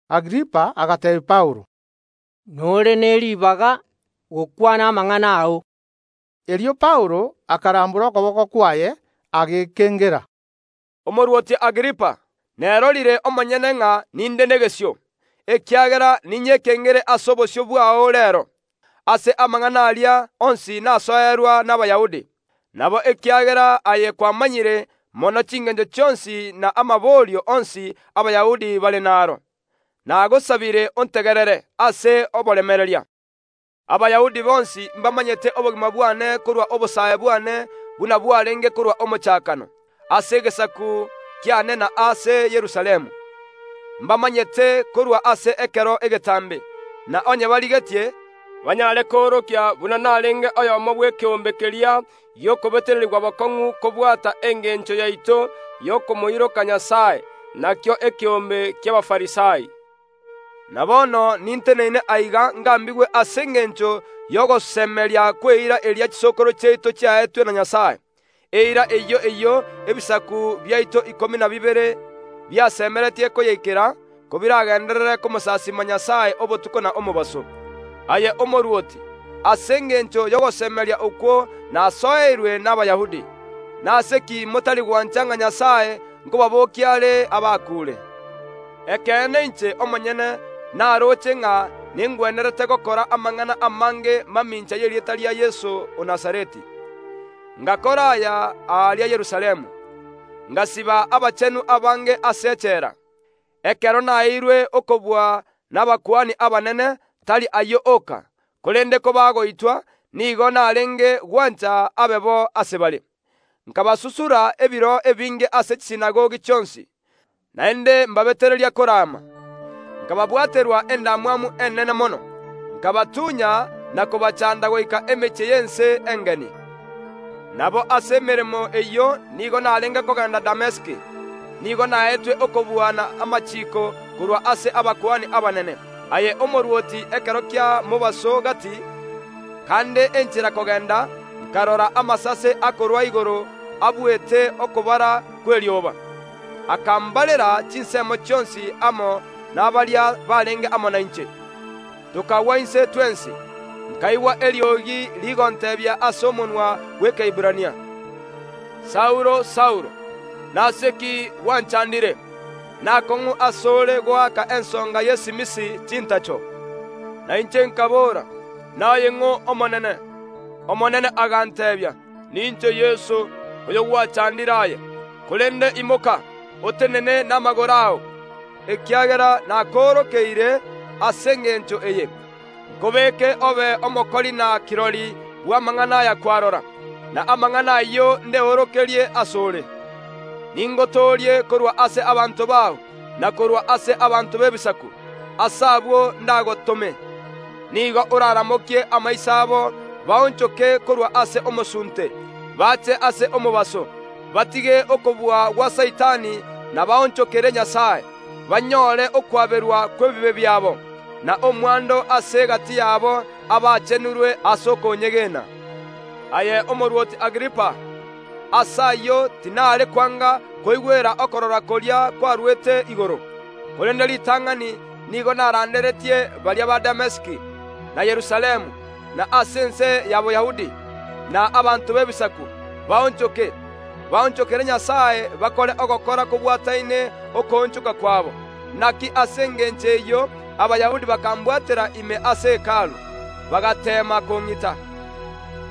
Agripa agateebia Paulo: “Nore ne ribaga gokwana amang’ana ao.” Erio Paulo akarambora okoboko kwaye, agekengera: “Omorwoti Agripa, nerorire omonyene ng’a ninde negesio, ekiagera ninyekengere ase obosio bwao reero, ase amang’ana aria onsi nasoerwa n’Abayahudi. Nabo ekiagera aye kwamanyire mono chingencho chionsi na amaborio onsi Abayahudi bare naro, nagosabire ontegerere ase oboremereria. “Abayahudi bonsi mbamanyete obogima bwane korwa obosae bwane buna bwarenge korwa omochakano, ase egesaku kiane na ase Yerusalemu. Mbamanyete korwa ase ekero egetambe, na onye barigetie, banyare koorokia buna narenge oyomo bw’ekeombe keria gi’okobetererigwa bokong’u kobwata engencho yaito y’okomoiroka Nyasae, nakio ekeombe ki’Abafarisai. Na bono ninteneine aiga ngambigwe ase engencho y’ogosemeria kw’eira eria chisokoro chiaito chiaetwe na Nyasae, eira eyio eyio ebisaku biaito ikomi na bibere biasemeretie koyeikera, kobiragenderere komosasiima Nyasae obotuko na omobaso. Aye omorwoti! Ase engencho y’ogosemeria okwo nasoereirwe n’Abayahudi. Nase ki motari gwancha nga Nyasae nkobabookia are abakuure? “Ekeene inche omonyene naroche ng’a nengwenerete gokora amang’ana amange mamincha y’erieta ria Yeso o Nazareti. Ngakora aya aria Yerusalemu: Ngasiba abachenu abange ase echela, ekero naeirwe okobua nabakuani abanene; tari ayio oka, korende kobagoitwa, nigo narenge gwancha abe bo ase bare. Nkabasusura ebiro ebinge ase chisinagogi chionsi, naende mbabetereria korama, nkababwaterwa endamwamu enene mono, nkabatunya na kobachanda goika emechie y’ense engeni. “Nabo ase emeremo eyio nigo narenge kogenda Damesiki, nigo naetwe okobua na amachiiko korwa ase abakuani abanene. Aye omorwoti, ekero kia mobaso gati, kande enchera kogenda, nkarora amasase akorwa igoro abuete okobara kw’erioba, akambarera chinsemo chionsi amo nabaria barenge amo nainche. Tokagwa inse twensi, nkaigwa eriogi rigonteebia ase omonwa bw’Ekeiberania: Saulo, Saulo, nase ki gwanchandire? Naakong’u ase ore goaka ensonga y’esimisi chintacho. Na inche nkaboora: Naye ng’Omonene? Omonene aganteebia: Ninche Yeso, oyogwachandire aye. Korende imoka, otenene namagoro ao, ekiagera nakoorokeire ase engencho eye: nkobeke obe omokori na kirori bw’amang’ana aya kwarora, na amang’ana ayio ndeorokerie ase ore. Ningotoorie korwa ase abanto bao, na korwa ase abanto b’Ebisaku, ase abwo ndagotome. Nigo oraramokie amaiso abo baonchoke korwa ase omosunte, bache ase omobaso, batige okobua gwa Saitani na baonchokere Nyasae, banyore okwaberwa kw’ebibe biabo, na omwando ase egati yabo abachenirwe ase okonyegena. “Aye omorwoti Agripa! Ase ayio tinare kwanga koigwera okorora koria kwarwete igoro, korende ritang’ani nigo naranderetie baria ba Damesiki, na Yerusalemu, na ase ense ya Boyahudi, na abanto b’Ebisaku, baonchoke, baonchokere Nyasae bakore ogokora kobwataine okoonchoka kwabo. Naki ase engencho eyio Abayahudi bakambwatera ime ase Hekalu, bagateema kong’ita.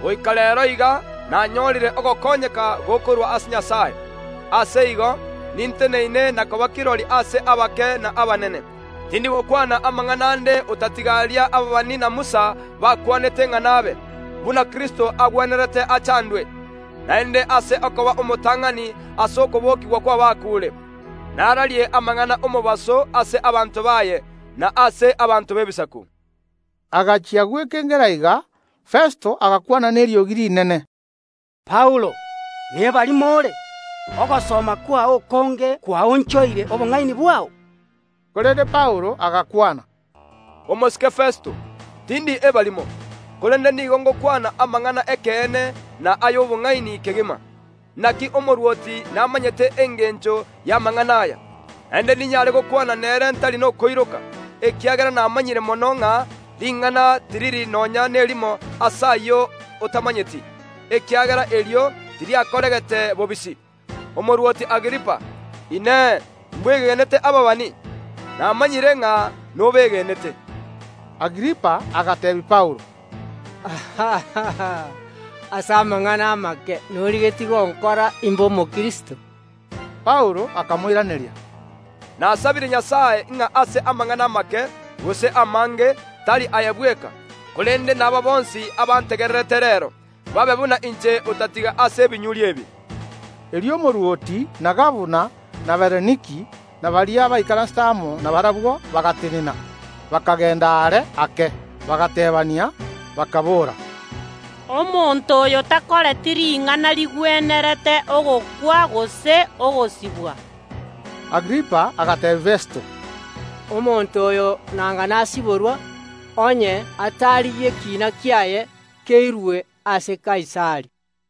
Goika reero iga nanyorire ogokonywa korwa ase Nyasae. Ase igo ninteneine na koba kirori ase abake na abanene. Tindi gokwana amang’ana ande otatiga aria ababani na Musa bakwanete ng’a nabe, buna Kristo agwenerete achandwe, naende ase okoba omotang’ani ase okobokigwa kw’abakuure, nararie amang’ana ’omobaso ase abanto baye, na ase abanto b’Ebisaku.” Agachia gwekengera iga, Festo agakwana neriogi rinene: “Paulo, nebarimo ore! Ogosoma kwao okonge kwaonchoire obong’aini bwao.” Korende Paulo agakwana: “Omosike Festo, tindi ebarimo, korende nigo ngokwana amang’ana ’ekeene na ay’obong’aini kegima. Naki omorwoti namanyete engencho y’amang’ana aya, naende ninyare gokwana nere ntari nokoiroka, ekiagera namanyire mono ng’a ring’ana tiriri nonya nerimo ase ayio otamanyeti, ekiagera erio tiriakoregete bobisi. Omorwoti Agripa, Inee, mbwegenete ababani? Namanyire ng’a nobegenete.” Agripa agateebia Paulo: “Ase amang’ana amake norigetie gonkora imbe Omokristo.” Paulo akamoiraneria: “Nasabire Nyasae ng’a ase amang’ana amake, gose amange, tari aye bweka, korende naba bonsi abantegererete reero, babe buna inche otatiga ase ebinyuri ebi.” Erio omorwoti, na gabana, na Bereniki, na baria baikaransete amo nabarabwo bagatenena, bakagenda are ake, bagateebania, bakaboora: “Omonto oyo takoreti ring’ana rigwenerete ogokwa gose ogosibwa.” Agripa agateebia Festo: “Omonto oyo nanga nasiborwa onye atarigia ekiina kiaye keirwe ase Kaisari.”